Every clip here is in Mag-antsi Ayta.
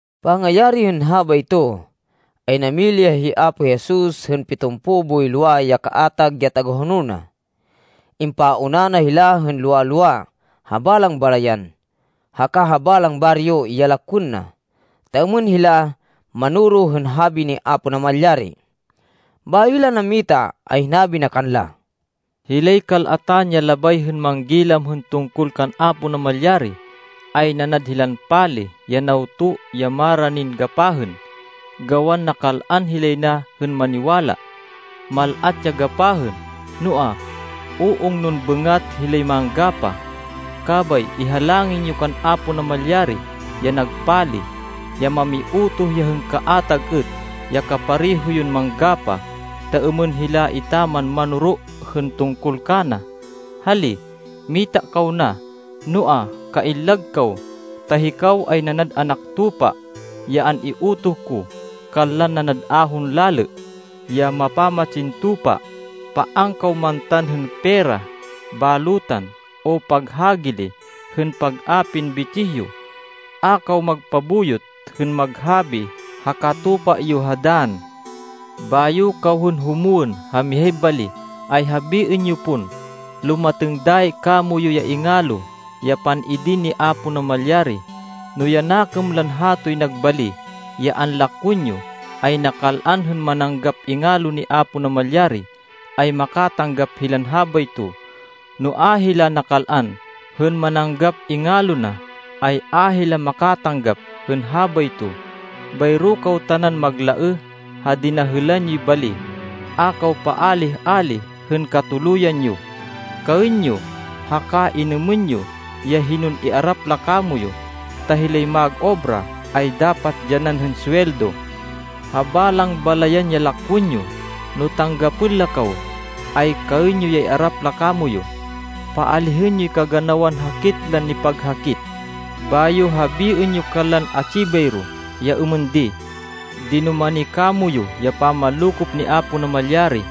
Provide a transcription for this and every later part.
Pangayari hên habayto, ay namili ya hi Apo Jesus hên pitumpo boy lowa ya kaatag ya tagahonol na. Impauna na hila hên lowa-lowa ha balang balayan haka ha balang baryo ya lakwên na, ta êmên hila manoro hên habi ni Apo Namalyari. Bayo hila nammita, ay hinabi na kanla, “Hilay kal-atan ya labay hên manggilam hên tungkol kan Apo Namalyari, ay nanad hilan pali ya nawto ya maranin gapahên, gawan nakal-an hilay na hên maniwala. Mal-at ya gapahên, noa, u-ungnon bêngat hilay manggapah. Kabay ihalangin yo kan Apo Namalyari, ya nag pali, ya mamiutoh ya hên kaatag êt, ya kapareho yon manggapah, ta êmên hila etaman manoro hên tungkol kana. Hali, mita kaw na. Noa, kaillag kaw, ta hikaw ay nanad anak tupa, ya an-iutoh ko kanlan nanad ahon lalê, ya mapamatsin tupa. Paan kaw mantan hên pera, balutan, o paghagili hên pag-apin bitsih yo. A kaw magpabuyot hên maghabi ha katupa yo ha dann. Bayo kaw hên humwên ha mihay bali, ay habiên yo pon, ‘Lumatêng dayi kamoyu ya ingalo ya pan-idin ni Apo Namalyari.’ No ya nakêm lan hatoy nag bali ya anlakwên yo ay nakal-an hên mananggap ingalo ni Apo Namalyari, ay makatanggap hilan habayto. No a hila nakal-an hên mananggap ingalo na, ay a hila makatanggap hên habayto. Bayro kaw tanan maglaêh ha dinahêlan yoy bali. A kaw paálih-álih hên katuluyan yo. Kaên yo, haka inêmên yo, ya hinon iarap la kamoyu, ta hilay mag-obra ay dapat dyanan hên suweldo. Ha balang balayan ya lakwên yo, no tanggapên la kaw, ay kaên yo ya iarap la kamoyu. Paalihên yoy kaganawan hakit lan nipaghakit, bayo habiên yo kanlan atsi bayro ya êmên di, ‘Dinumani kamoyu ya pamanlokop ni Apo Namalyari.’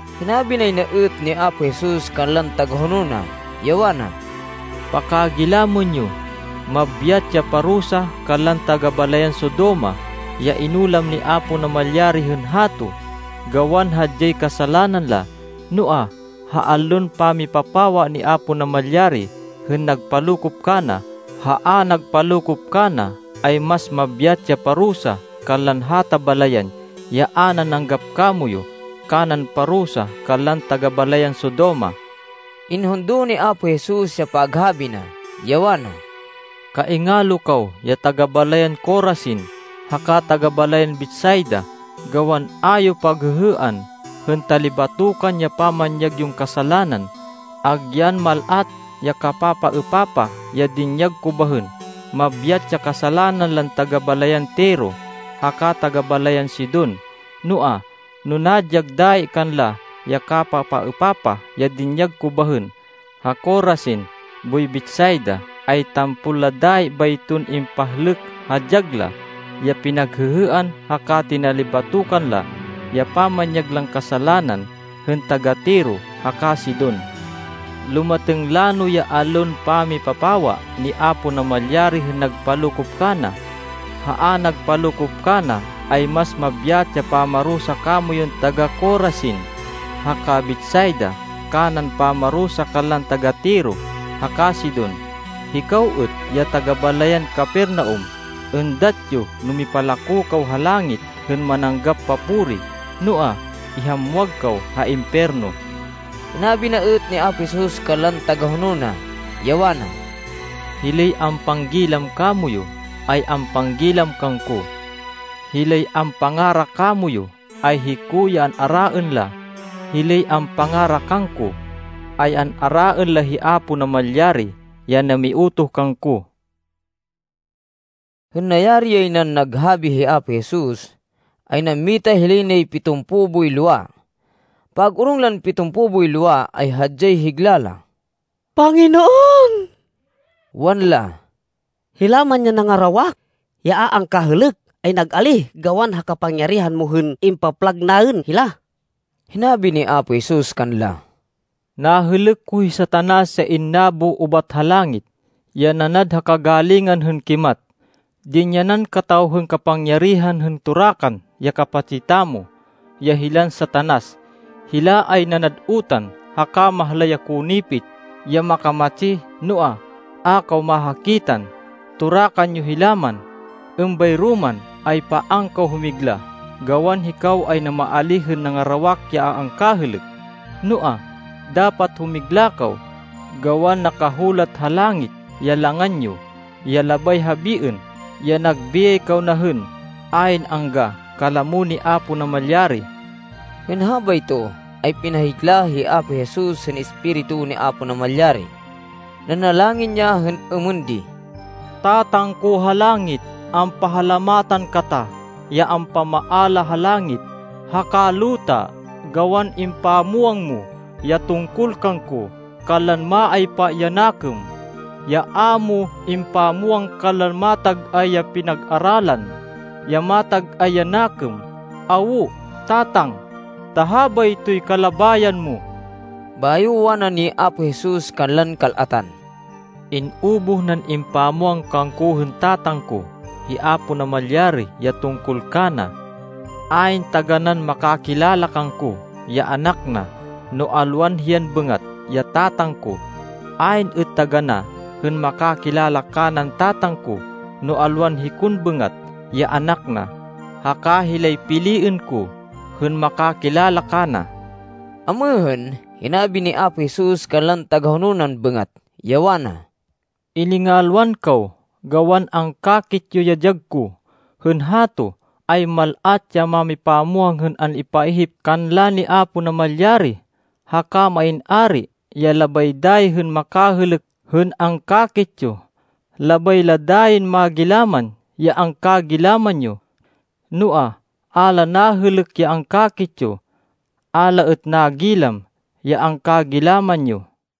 Hinabi nay na êt ni Apo Jesus kanlan tagahonol na, ya wana, “Pakagilamên yo, mabyat ya parusa kanlan taga-balayan Sodoma ya inulam ni Apo Namalyari hên hato, gawan hadyay kasalanan la. Noa, ha allon pamipapawa ni Apo Namalyari hên nagpalokop kana ha a nagpalokop kana, ay mas mabyat ya parusa kanlan hata balayan ya a nananggap kamoyu kanan parusa kanlan taga-balayan Sodoma.” Inhundo ni Apo Jesus ya paghabi na, ya wana, “Kaingalo kaw ya taga-balayan Corazin haka taga-balayan Betsaida gawan a yo paghêhêan hên talibatokan ya pamanyag yon kasalanan, agyan mal-at ya kapapaêpapah ya dinyag ko bahên. Mabyat ya kasalanan lan taga-balayan Tiro haka taga-balayan Sidon. Noa, no nadyag dayi kanla ya kapapaêpapah ya dinyag ko bahên ha Corazin boy Betsaida, ay tampol la dayi bayton impahlêk ha dyag la ya pinaghêhêan haka tinalibatokan la ya pamanyag lan kasalanan, hên taga-Tiro haka Sidon. Lumatêng lano ya allon pamipapawa ni Apo Namalyari hên nagpalokop kana, ha a nagpalokop kana, ay mas mabyat ya pamarusa kamoyun taga-Corazin haka Betsaida kanan pamarusa kanlan taga-Tiro haka Sidon. Hikaw êt, ya taga-balayan Capernaum, êndat yo no mipalako kaw ha langit hên mananggap papuri, noa, ihamwag kaw ha impiyerno.” Hinabi na êt ni Apo Jesus kanlan tagahonol na, ya wana, “Hilay ampanggilam kamoyu, ay ampanggilam kangko. Hilay ampangara kamoyu, ay hiko ya an-araên la. Hilay ampangara kangko, ay an-araên la hi Apo Namalyari ya namiutoh kangko.” Hên nayari yay nan naghabi hi Apo Jesus, ay nammita hilay nay pitumpo boy lowa. Pag-orong lan pitumpo boy lowa, ay hadyay higla la. “Panginoon,” wanla, “hila man ya nangarawak ya a angkahêlêk ay nag-alíh gawan ha kapangyarihan mo hên impaplag naên hila.” Hinabi ni Apo Jesus kanla, “Nahêlêk ko hi Satanas ya innabo ubat ha langit, ya nanad ha kagalingan hên kimat. Dinyanan kataw hên kapangyarihan hên torakan ya kapatsi tamo, ya hilan Satanas. Hila ay nanad utan haka mahlay ya konipit ya makamatsi, noa, a kaw mahakitan, torakan yo hila man. Êmbayro man, ay paan kaw humigla, gawan hikaw ay namaalíh hên nangarawak ya a angkahêlêk. Noa, dapat humigla kaw, gawan nakahulat ha langit ya langan yo, ya labay habiên ya nag biyay kaw na hên ayn angga kalamo ni Apo Namalyari.” Hên habayto, ay pinahigla hi Apo Jesus hên Espiritu ni Apo Namalyari. Nanalangin ya hên êmên di, “Tatang ko ha langit, ampahalamatan kata, ya ampamaala ha langit haka luta, gawan impamwang mo ya tungkol kangko kanlan maaypa ya nakêm, ya a mo impamwang kanlan matag-ay ya pinag-aralan, ya matag-ay ya nakêm. Awo, Tatang, ta habaytoy kalabayan mo.” Bayo wani ni Apo Jesus kanlan kal-atan, “In-ubuh nan impamwang kangko hên Tatang ko, hi Apo Namalyari ya tungkol kana. Ayn taganán makakilala kangko, ya Anak na, no alwan hiyan bêngat ya Tatang ko. Ayn êt taganá hên makakilala kanan Tatang ko, no alwan hikon bêngat, ya Anak na, haka hilay piliên ko hên makakilala kana.” Amêhên, hinabi ni Apo Jesus kanlan tagahonol nan bêngat, ya wana, “Iningalwan kaw, gawan angkakit yo ya dyag ko. Hên hato, ay mal-at ya mámipamwang hên an-ipaihip kanla ni Apo Namalyari, haka main ari ya labay dayi hên makahêlêk hên angkakit yo. Labay la dayin magilaman ya angkagilaman yo. Noa, a la nahêlêk ya angkakit yo. A la êt nagilam ya angkagilaman yo.”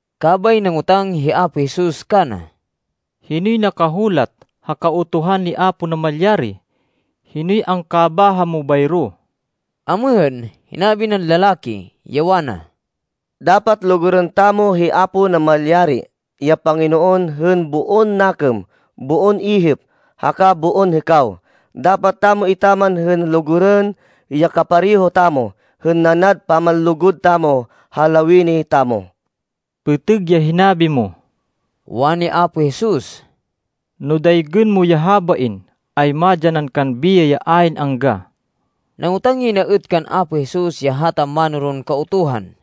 Kabay nangotang hi Apo Jesus kana, “Hinoy nakahulat ha Kautuhan ni Apo Namalyari? Hinoy angkabáha mo bayro?” Amêhên, hinabi nan lalaki, ya wana, “Dapat lugurên tamo hi Apo Namalyari, ya Panginoon hên boon nakêm, boon ihip, haka boon hêkaw. Dapat tamo etaman hên lugurên ya kapareho tamo hên nanad pamanlugud tamo ha lawini tamo.” “Pêtêg ya hinabi mo,” wani Apo Jesus. “No daygên mo ya habain, ay madyanan kan biyay ya ayn angga.” Nangotang yay na êt kan Apo Jesus ya hata mánoron Kautuhan,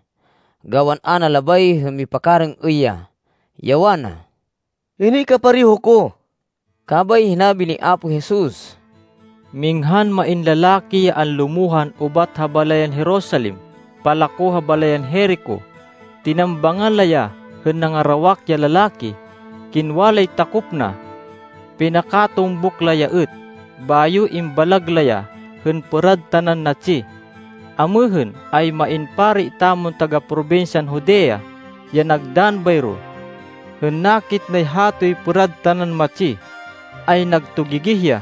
gawan a na labay hên mipakarêng-êy ya, ya wana, “Hinoy kapareho ko?” Kabay hinabi ni Apo Jesus, “Minghan main lalaki ya anlumohan ubat ha balayan Jerusalem palako ha balayan Jerico. Tinambangan la ya hên nangarawak ya lalaki. Kingwa lay takop na. Pinakatumbuk la ya êt. Bayo imbalag la ya hên pêrad tanan natsi. Amêhên, ay main pari tamon taga-probinsyan Judea, ya nagdann bayro. Hên nakit nay hatoy pêrad tanan matsi, ay nagtugigih ya.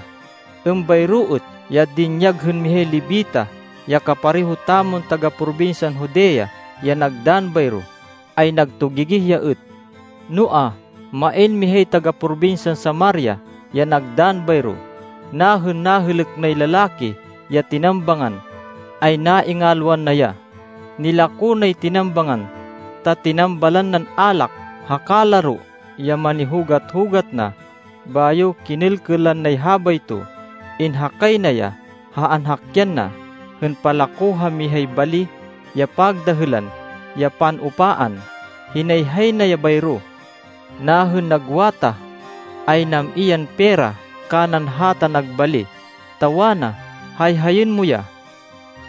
Êmbayro êt ya dinyag hên mihay Levita, ya kapareho tamon taga-probinsyan Judea ya nagdann bayro, ay nagtugigih ya êt. Noa, main mihay taga-probinsyan Samaria, ya nagdann bayro. Nahên nahêlêk nay lalaki ya tinambangan, ay naingalwan na ya. Nilako nay tinambangan, ta tinambalan nan alak haka laro ya manihugat-hugat na, bayo kinêlkêlan nay habayto. Inhakay na ya ha anhakyan na, hên palako ha mihay bali ya pagdahêlan ya pan-upaan. Hinayhay na ya bayro. Nahên nagwatah, ay nam-i yan pera kanan hata nag bali, ta wana, ‘Hayhayên mo ya.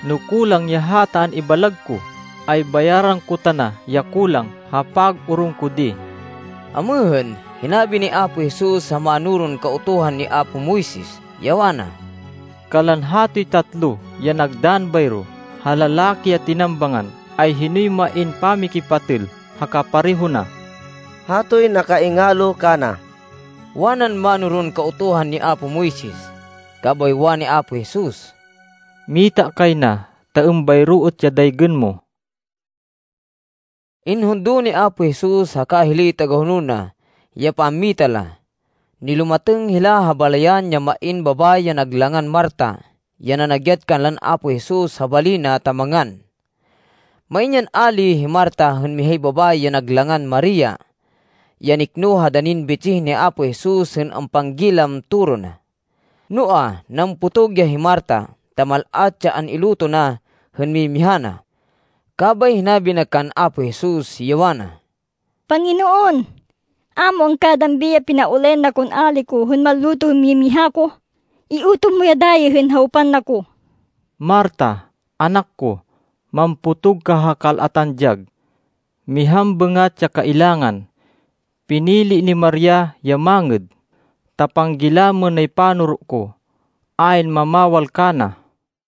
No kulang ya hata an-ibalag ko, ay bayaran ko tana ya kulang ha pag-orong ko di.’” Amêhên, hinabi ni Apo Jesus ha mánoron Kautuhan ni apo Moises, ya wana, “Kanlan hatoy tatlo ya nagdann bayro ha lalaki ya tinambangan, ay hinoy main pamikipatêl ha kapareho na?” “Hatoy nakaingalo kana,” wanan mánoron Kautuhan ni apo Moises. Kabay wani Apo Jesus, “Mita kay na, ta êmbayro êt ya daygên mo.” Inhundo ni Apo Jesus haka hilay tagahonol na ya pammita la. Nilumatêng hila ha balayan ya main babayi ya nag langan Marta ya nanagyat kanlan Apo Jesus ha bali na, ta mangan. Main yan ali hi Marta hên mihay babayi ya nag langan Maria, ya nikno ha danin bitsih ni Apo Jesus hên ampanggilam toro na. Noa, nampotog ya hi Marta ta mal-at ya an-iluto na hên mimiha na. Kabay hinabi na kan Apo Jesus, ya wana, “Panginoon, a mo angkadambi ya pinaulayan na kon ali ko hên manluto hên mimiha ko? Iutoh mo ya dayi hên hawpan na ko.” “Marta, anak ko, mampotog ka ha kal-atan dyag. Mihan bêngat ya kailangan. Pinili ni Maria ya mangêd, ta panggilamên nay panoro ko. Ayn mamawal kana.”